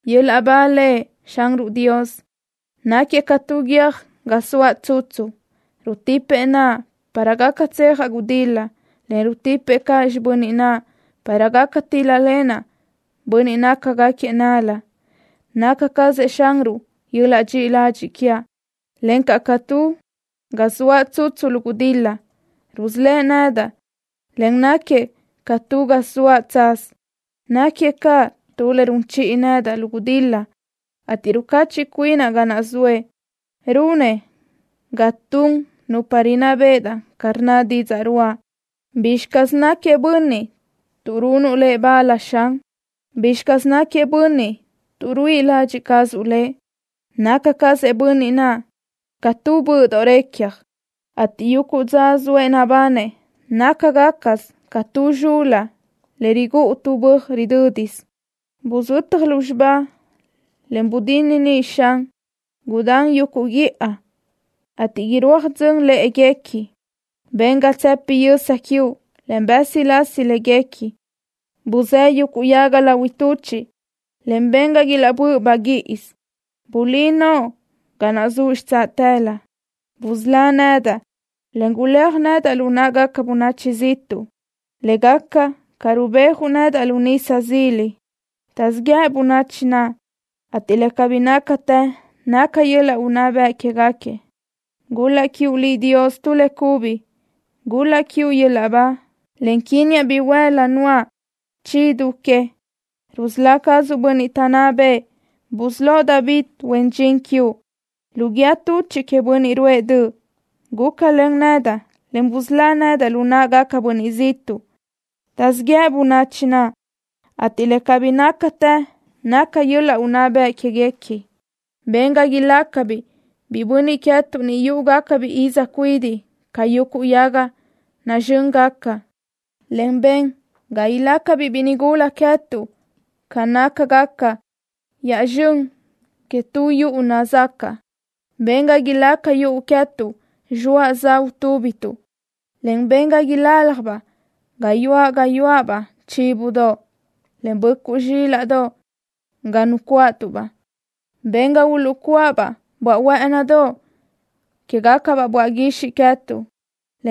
¡Yöl-laʼ ba Lëʼ, Xanruʼ Dios! ¡Náquiëʼ ca tu guiö́j ga zoaʼ tsutsu! Rutipëʼ naʼa para gaca tsejaʼ gudil-la, en rutipëʼ caʼ xibö́n naʼa para gaca tíl-lalenaʼ bönniʼ nácagaquiëʼ nál-la. Naca cazëʼ Xanruʼ yöl-laʼ dxiʼi ladxiʼ quiaʼ, encaʼ ca tu ga zoaʼ tsutsu lu gudil-la. Rusölë́ʼ nedaʼ, en náquiëʼ ca tu ga zoaʼ tsaz. Náquiëʼ ca tu le run chiʼi nedaʼ lu gudil-la, ateʼ rucachiʼ cuinaʼ ga naʼ zoëʼ. Runëʼ ga tun nupa rinná béʼedaʼ ca rnna didzaʼ ruʼa. ¿Bízxatë caz náquiëʼ bönniʼ tuʼ runuʼ lëʼ ba láʼana, Xan? ¿Bízxatë caz náquiëʼ bönniʼ tuʼ ruíʼi ladxiʼ cazuʼ lëʼ? Naca cazëʼ bönniʼ naʼ ca tu böʼdoʼ recja, ateʼ yuguʼ dza zoëʼ nabanëʼ nácagacasö ca tu zxul-la le rigúʼu tu böaj ridö́disö. Buzötaj lúzxiba, en bdinne ni, Xan. Gudán yuguʼ guíʼa, ateʼ irúaj dzön lë́ʼeguequi. Ben ga tsëpi yösa quiuʼ, en bë́silasi léguequi. Busë́ yuguʼ yaga lahui tuchiʼ, en ben ga ilaʼbö́ʼ baguíʼisö. Bulí noʼo ga naʼ zuʼ xitsáʼalö. Busölá nedaʼ, en guléaj nedaʼ lu náʼagaca bönachi ziʼtuʼ, le gaca ca rubéajuʼ nedaʼ lu nisa zila. Taʼzíʼ yëʼ bönachi naʼ, ateʼ le cabí nácatë naca yöl-laʼ unná bëʼ quéguequi. ¡Gul-laʼ quiuʼ Liʼ, Dios, tu le cubi! ¡Gul-laʼ quiuʼ yöl-laʼ ba, en quínniaʼ bihuël-la nuáʼ chi du que! Rusölá cazuʼ bönniʼ taʼnná bëʼë. Busölóʼ David, huen dxin quiuʼ, lu guíë tuchiʼ queëʼ bönniʼ ruʼë döʼ. Gúcalen nedaʼ, en busölá nedaʼ lu náʼagaca bönachi ziʼtuʼ. Taʼzíʼ yëʼ bönachi naʼ, ateʼ le cabí nácatë naca yöl-laʼ unná bëʼ quéguequi. Ben ga ilácabiʼ biʼi bönniʼ queë́tuʼ ni yuʼugacabiʼ iz cuidiʼ ca yuguʼ yaga nazxö́ngaca, en ben ga ilácabiʼ biʼi nigula queë́tuʼ ca nácagaca yaʼzxén que tu yuʼu nazacaʼ. Ben ga ilígaca yuʼu queë́tuʼ zxoaʼ za utúbituʼ, en ben ga iláljabaʼ gayuáʼ gayuáʼabaʼ chíbodoʼ, en böʼcuʼ zxílaʼdoʼ ga nucuáʼatuʼ-baʼ. Ben ga uluʼcuáʼabaʼ böaʼ huë́ʼënidoʼ quégaca böaʼ guixiʼ queë́tuʼ,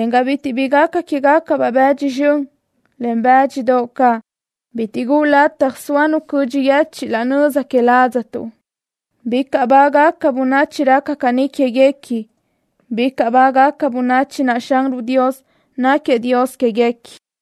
en ga bitiʼ bi gaca quégacabaʼ bëdxi zxön, en bë́dxidoʼ caʼ. Bitiʼ guʼu lataj soa nu cödxi yechiʼ laʼ nöza que ládzatuʼ. ¡Bicaʼ bágaca bönachi raca caní quéguequi! ¡Bicaʼ bágaca bönachi naʼ Xanruʼ Dios náquiëʼ Dios quéguequi!